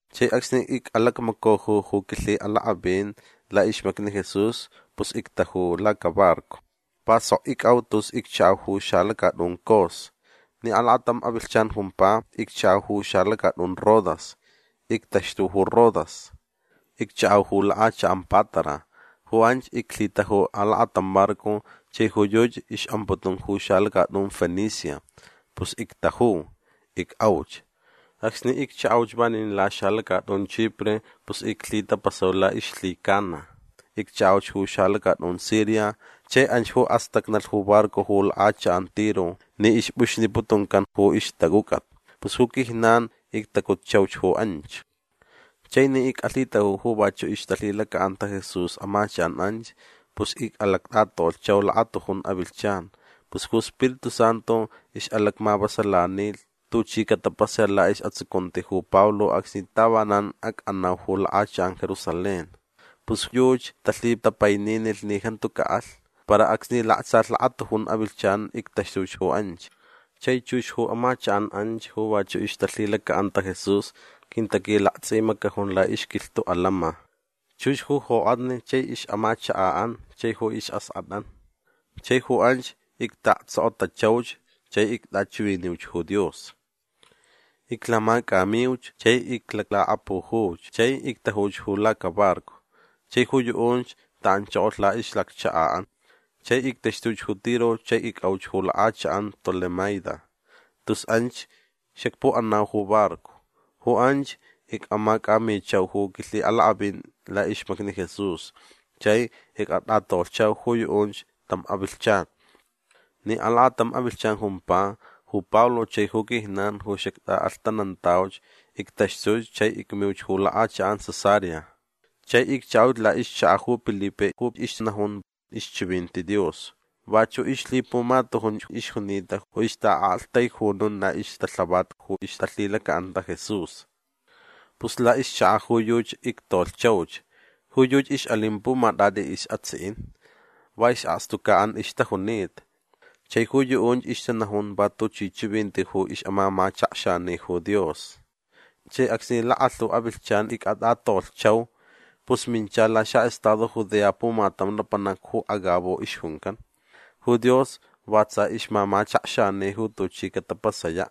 Chai acsni ic'alacmacaju ju quilhi'alak'avin la'ixmacni Jesús pus ictaju lacabarco. Va sok ic'au tus iccha'au ju xalacat'un Cos. Ni alakatam avilhchan jumpa iccha'au ju xalacat'un Rodas. Ictaxtu ju Rodas. Iccha'au ju lak'achak'an Pátara. Ju anch iclhitaju alakatam barco chai ju yuchi ix'amputun ju xalacat'un Fenicia. Pus ictaju. Ic'auch. Acsni iccha'auch vanin laxalacat'un Chipre pus iclhitapasau la'ixlhicana. Iccha'auch ju xalacat'un Siria chai anch ju astacnalh ju barco ju lak'achak'an Tiro ni ixp'uxniputuncan ju ixtac'uc'at. Pus ju quijnan ictacutchauch ju anch. Chai ni ic'alhitaju ju vachu' ixtalhilaca'anta Jesús amachak'an anch pus ic'alact'atolhchau lakatujun avilhchan. Pus ju Spiritu Santu ix'alacmavasalanilh tuchi catapasaya' la'is'atsucunti ju Pablo acsni tavanan ac'anau ju lak'achak'an Jerusalén. Pus yuchi talhitapaininilh ni jantu ca'alh. Para acsni laktsalh ju lakatujun avilhchan ictaxtuch ju anch. Chai chux ju amachak'an anch ju vachu' ixtalhilaca'anta Jesús quintaquilakts'imacajun la'ixquilhtu' alama. Chux ju jok'atni chai ix'amachaka'an chai ju is'ask'at'an. Chai ju anch icta'aktsokotachauch chai ict'achiviniuch ju Dios. Iclamac'amiuch chai iclalakapujuch chai ictajuch ju lacabarco. Chai ju yu'unch ta'anchokolh la'ixlakchaka'an. Chai ictaxtuch ju Tiro chai ic'auch ju lak'achak'an Tolemaida. Tus anch xacpu'anau ju barco. Ju anch ic'amac'amichau ju quilhi'alak'avin la'ixmacni Jesús chai ic'at'atolhchau ju yu'unch tam avilhchan. Ni alakatam avilhchan jumpa ju Pablo chai ju quijnan ju xact'a'alhtanantauch ictaxtuch chai icmiuch ju lak'achak'an Cesarea. Chai iccha'auch la'ixchaka' ju Pilipe ju ixnajun ixchivinti Dios. Vachu' ixlhipumatujunch ixjunita ju ixta'a'aktaijunun la'ixtalhavat ju ixtalhilaca'anta Jesús. Pus la'ixchaka' ju yuchi ictolhchauch. Ju yuchi ix'alin pumat'at'i is'atsi'in. Va is'akstuca'an ixtajunita. Chai ju yu'unch ixtanajun va tuchi chivinti ju ix'amamachakxani ju Dios. Chai acsni lakalhu avilhchan ic'at'atolhchau pus mincha laxa'estado Judea pumatam lapanac ju Agabo ixjuncan. Ju Dios va tsa ixmamachakxani ju tuchi catapasaya'.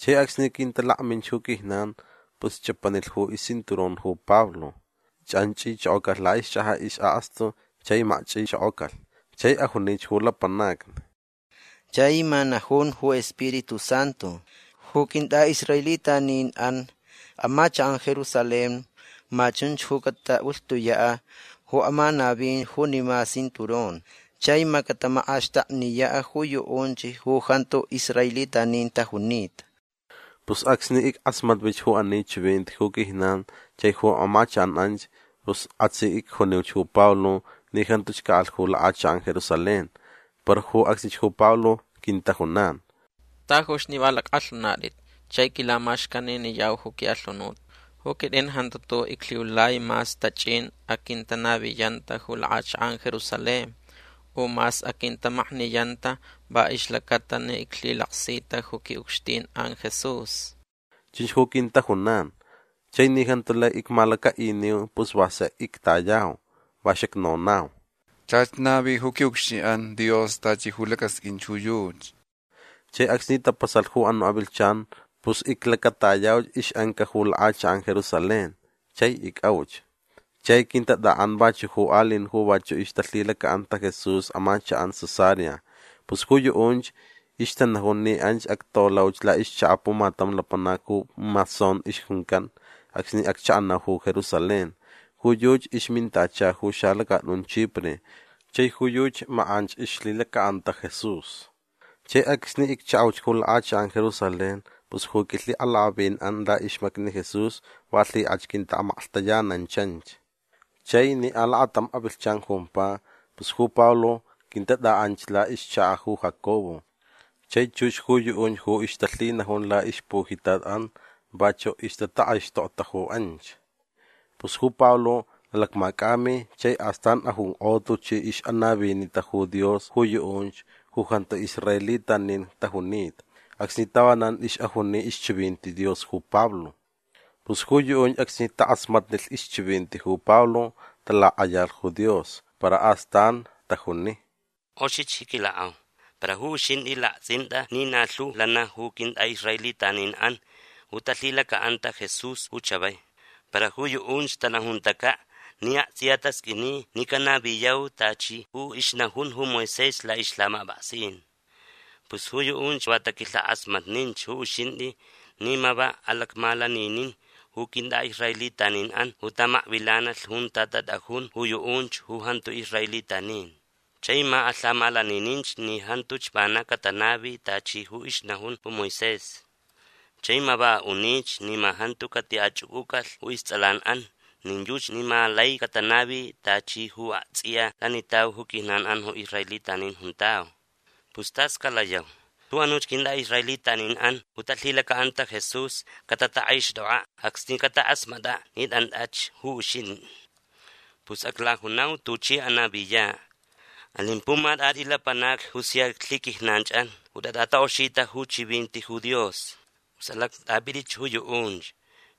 Chai acsni quintalakminch ju quijnan pus ch'apanilh ju iscinturón ju Pablo. Ch'anch'ichokocalh la'ixch'aja' is'akstu chai makch'ichokocalh. Chai ajunich ju lapanacni: ―Chani ma najun ju Spiritu Santu. Ju quint'a'israelitanin'an amachak'an Jerusalén ma chunch ju cata'ulhtuya' ju amanavin junima cinturón chai ma catamak'axtakniya' ju yu'unch ju jantu israelitanin tajunita. Pus acsni ick'asmatvich ju ani chivinti ju quijnan chai ju amachak'an anch pus k'asi icjuniuch ju Pablo ni jantuch ca'alh ju lak'achak'an Jerusalén. Para ju acsnich ju Pablo quintajunan: ―Tajuch ni va lack'alhunat'itch chai quilamaxcaniniyau ju qui'alhunut. Ju quit'in jantu tu'u' iclhiulai mas tach'in aquintanaviyanta ju lak'achak'an Jerusalén. U mas aquintamakniyanta va ixlacata ni iclhilaksita ju qui'ucxtin'an Jesús. ―Chunch ju quintajunan. Chai ni jantu lai icmalaca'iniu pus va sek ictayau. Va xacnonau: ―Chach navi ju qui'ucxtin'an Dios tachi ju lacasq'uinch ju yuchi. Chai acsni tapasalh ju anu' avilhchan pus iclacatayauch ix'anca ju lak'achak'an Jerusalén. Chai ic'auch. Chai quintat'a'an vachu' ju ali'in ju vachu' ixtalhilaca'anta Jesús amachak'an Cesarea. Pus ju yu'unch ixtanajun ni anch actolauch la'ixchaka' pumatam lapanac ju Mnasón ixjuncan acsni accha'anau ju Jerusalén. Ju yuchi ixmintacha ju xalacat'un Chipre. Chai ju yuchi mak'anch ixlhilaca'anta Jesús. Chai acsni iccha'auch ju lak'achak'an Jerusalén pus ju quilhi'alak'avin'an la'ixmacni Jesús va lhik'ach quinta'amaklhtayanantanch. Chai ni alakatam avilhchan jumpa pus ju Pablo quintat'a'anch la'ixchaka' ju Jacobo. Chai chux ju yu'unch ju ixtalhinajun la'ixpujitat'an vachu' ixtatak'aixtokta ju anch. Pus ju Pablo alacmac'ami chai astan ajunk'o tuchi ix'anavinita ju Dios ju yu'unch ju jantu israelitanin tajunita acsni tavanan ix'ajuni ixchivinti Dios ju Pablo. Pus ju yu'unch acsni tak'asmatnilh ixchivinti ju Pablo talak'ayalh ju Dios. Para astan tajuni: ―K'oxich ji quilak'au. Para ju uxint'i lakts'int'a ni na lhu lana ju quint'a'israelitanin'an ju talhilaca'anta Jesús ju chavai. Para ju yu'unch tanajuntaca' ni akts'iya tasq'uini ni canaviyau tachi ju ixnajun ju Moisés la'ixlhamap'aksin. Pus ju yu'unch va taquik'alhak'asmatninch ju uxint'i ni ma va alacmalaninin ju quint'a'israelitanin'an ju tamakvilanalh junta tat'ajun ju yu'unch ju jantu israelitanin. Chai ma alhamalanininch ni jantuch vana catanavi tachi ju ixnajun ju Moisés. Chai ma va a'unich ni ma jantu cati'ach'uc'ucalh ju ists'alan'an nin yuchi ni ma lai catanavi tachi ju akts'iya lanitau ju quijnan'an ju israelitanin juntau. Pus tas calayau. Ju anuch quint'a'israelitanin'an ju talhilaca'anta Jesús catatak'aixt'ok'a' acsni catak'asmat'a' ni t'ant'ach ju uxint'i. Pus aclajunau tuch'i anaviya'. Alin pumat'at'i lapanacni ju sia lhiquijnanch'an ju tat'atak'oxita ju chivinti ju Dios. Pus alact'ap'it'ich ju yu'unch.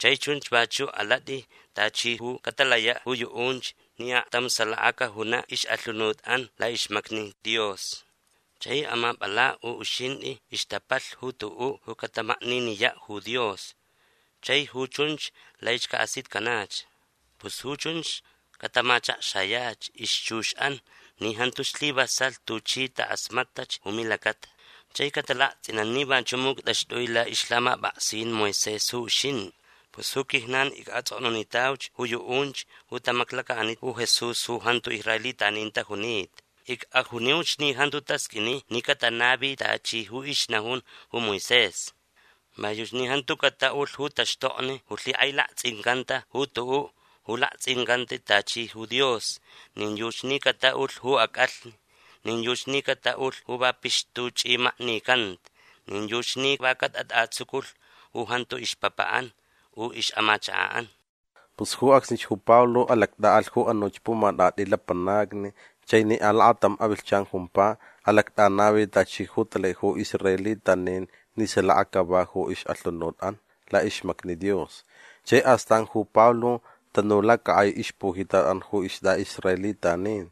Chai chunch vachu' alat'i tachi ju catalaya' ju yu'unch ni aktam salaka cajuna' ix'alhunut'an la'ixmacni Dios. Chai amap'ala' ju uxint'i ixtapalh ju tu'u' ju catamakniniya' ju Dios. Chai ju chunch laich ca'asitcanach. Pus ju chunch catamachakxayach ixchux'an ni jantu slivasalh tuchi tak'asmat'ach ju milacata. Chai catalakts'inan ni vachu' muct'axt'ui la'ixlhamap'aksin Moisés ju uxint'i. Pus ju quijnan ic'ats'oknunitauch ju yu'unch ju tamaklaca'anita ju Jesús ju jantu israelitanin tajunita. Ic'ajuniuch ni jantu tasq'uini ni catanavi tachi ju ixnajun ju Moisés. Va yuchi ni jantu cata'ulh ju taxtokni ju lhik'ailakts'incanta ju tu'u' ju lakts'incanta tachi ju dios. Nin yuchi ni cata'ulh ju ac'alhni. Nin yuchi ni cata'ulh ju va pixtuch'imaknicanta. Nin yuchi ni va catat'atsuculh ju jantu ixpapa'an u ix'amachaka'an. Pus ju acsnich ju Pablo alact'a'alh ju anuch pumat'at'i lapanacni chai ni alakatam avilhchan jumpa alact'anavi tachi ju talai ju israelitanin ni salaka cava ju ix'alhunut'an la'ixmacni Dios. Chai astan ju Pablo tanu lacak'ai ixpujitat'an ju ist'a'israelitanin.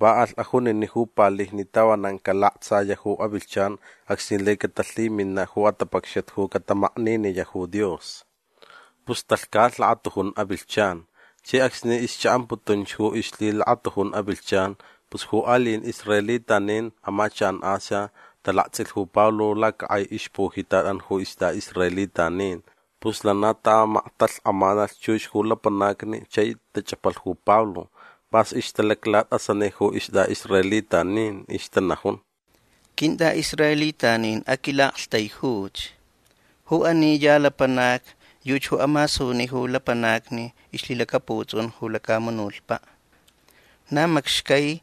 Va alh ajunini' ju palijni tavanan calaktsaya' ju avilhchan acsni lai catalhimina' ju atapacxat ju catamakniniya' ju Dios. Pus talhcalh lakatujun avilhchan. Chai acsni ixcha'amputunch ju ixlhilakatujun avilhchan pus ju ali'in israelitanin amachak'an Asia talakts'ilh ju Pablo lacak'ai ixpujitat'an ju ist'a'israelitanin. Pus lana tamaktalhk'amalh chux ju lapanacni chai tach'apalh ju Pablo. P'as ixtalaclat'asani ju ist'a'israelitanin. Ixtanajun: ―Quint'a'israelitanin aquila'aktaijuch. Ju ani ya lapanac yuchi ju amasuni ju lapanacni ixlhilacaputs'un ju lacamunutpa'. Na macxcai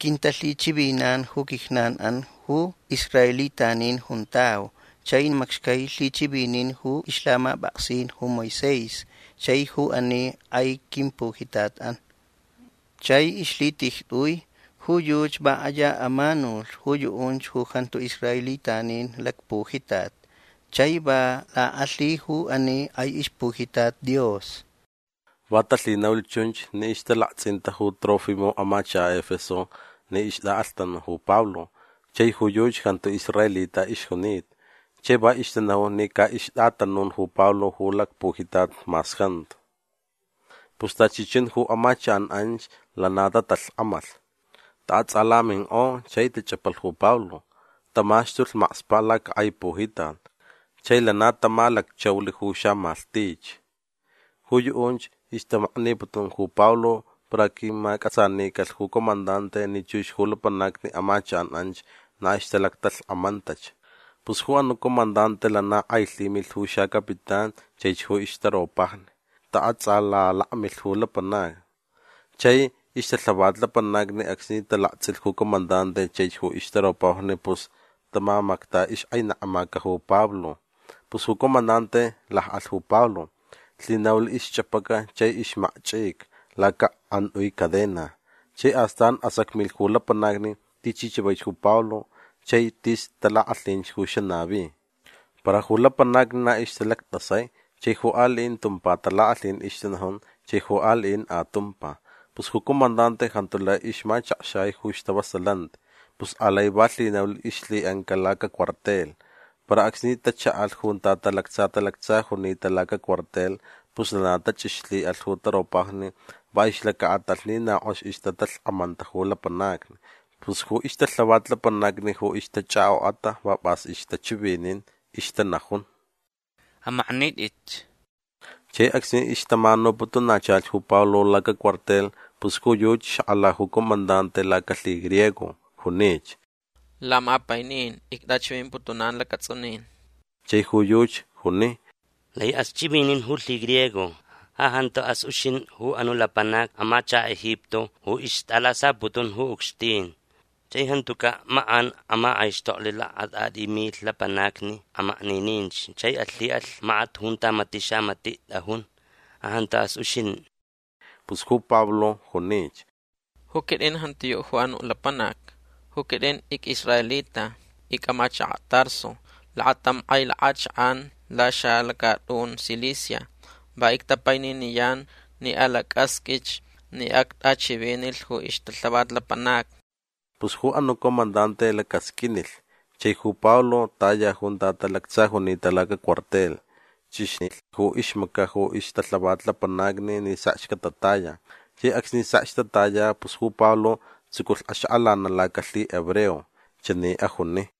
quintalhichivinan ju quijnan'an ju israelitanin juntau chai macxcai lhichivinin ju ixlhamap'aksin ju Moisés chai ju ani k'ai quimpujitat'an. Chai ixlhitijt'ui ju yuchi va k'aya amanulh ju yu'unch ju jantu israelitanin lacpujitat chai va lak'alhilh ju ani k'ai ixpujitat Dios. Va talhinaulh chunch ni ixtalakts'inta ju Trófimo amachaka' Efeso ni ixt'a'alhtanan ju Pablo chai ju yuchi jantu israelita ixjunita. Chai va ixtanajun ni ca ixt'atanun ju Pablo ju lacpujitat mas jantu. Pus tachi chun ju amachak'an anch lana tatalhk'amalh. Ta'ats'alamink'o chai tach'apalh ju Pablo. Tamaxtulh makspa' lacak'ai pujitat. Chai lana tamalacchaulh ju xamalhtich. Ju yu'unch ixtamakniputun ju Pablo para quimac'atsanicalh ju comandante ni chux ju lapanacni amachak'an anch na ixtalaktalhk'amantach. Pus ju anu' comandante lana k'ailhimilh ju xacapitán chaich ju ixtaropajni. Ta'ats'alalakmilh ju lapanacni. Chai ixtalhavat lapanacni acsni talakts'ilh ju comandante chaich ju ixtaropajni pus tamamacta ixk'ainekmaca ju Pablo. Pus ju comandante lak'alh ju Pablo. Lhinaulh ixch'apaca chai ixmakch'ica lacak'ant'ui cadena. Chai astan asacmilh ju lapanacni tichi chavaich ju Pablo chai tis talak'alhinch ju xanavi. Para ju lapanacni na ixtalact'asai chai ju ali'in tumpa talak'alhin ixtanajun chai ju ali'in atumpa. Pus ju comandante jantu lai ixmachakxai ju stavasalanti. Pus alai va lhinaulh ixlhi'anca lacacuartel. Para acsni tacha'alh junta talactsa talactsa junita lacacuartel pus lana tach'ixlhi'alh ju taropajni va ixlaca'atalh ni na k'ox ixtatalhk'amanta ju lapanacni. Pus ju ixtalhavat lapanacni ju ixtach'ak'ok'ata va p'as ixtachivinin. Ixtanajun: ―Amaknit'itch. Chai acsni ixtamanuputunachalh ju Pablo lacacuartel pus ju yuchi xak'ala ju comandante lacalhigriego. Junich: ―Lamapainin ict'achivimputunan lacats'unin. Chai ju yuchi juni: ―Lai'as ch'ivinin ju lhigriego. Ja janta'as uxint'i ju anu' lapanac amachaka' Egipto ju ixt'alasaputun ju ucxtin. Chai jantuca' mak'an amak'aixtoklh lakat'at'i milh lapanacni amaknininch chai alhi'alh makat junta mati' xamati' t'ajun. Ja janta'as uxint'i. Pus ju Pablo junich: ―Ju quit'in jantiyu' ju anu' lapanac. Ju quit'in ic'israelita. Ic'amachaka' Tarso. Lakatam k'ai lak'achak'an laxalacat'un Cilicia. Va ictapaininiyan ni alac'asq'uich ni act'achivinilh ju ixtalhavat lapanacni. Pus ju anu' comandante lacasq'uinilh. Chai ju Pablo taya junta talactsa junita lacacuartel. Ch'ixnilh ju ixmaca' ju ixtalhavat lapanacni ni sekch catataya. Chai acsni sekch tataya pus ju Pablo tsuculh axak'alana' lacalhihebreo. Chani ajuni: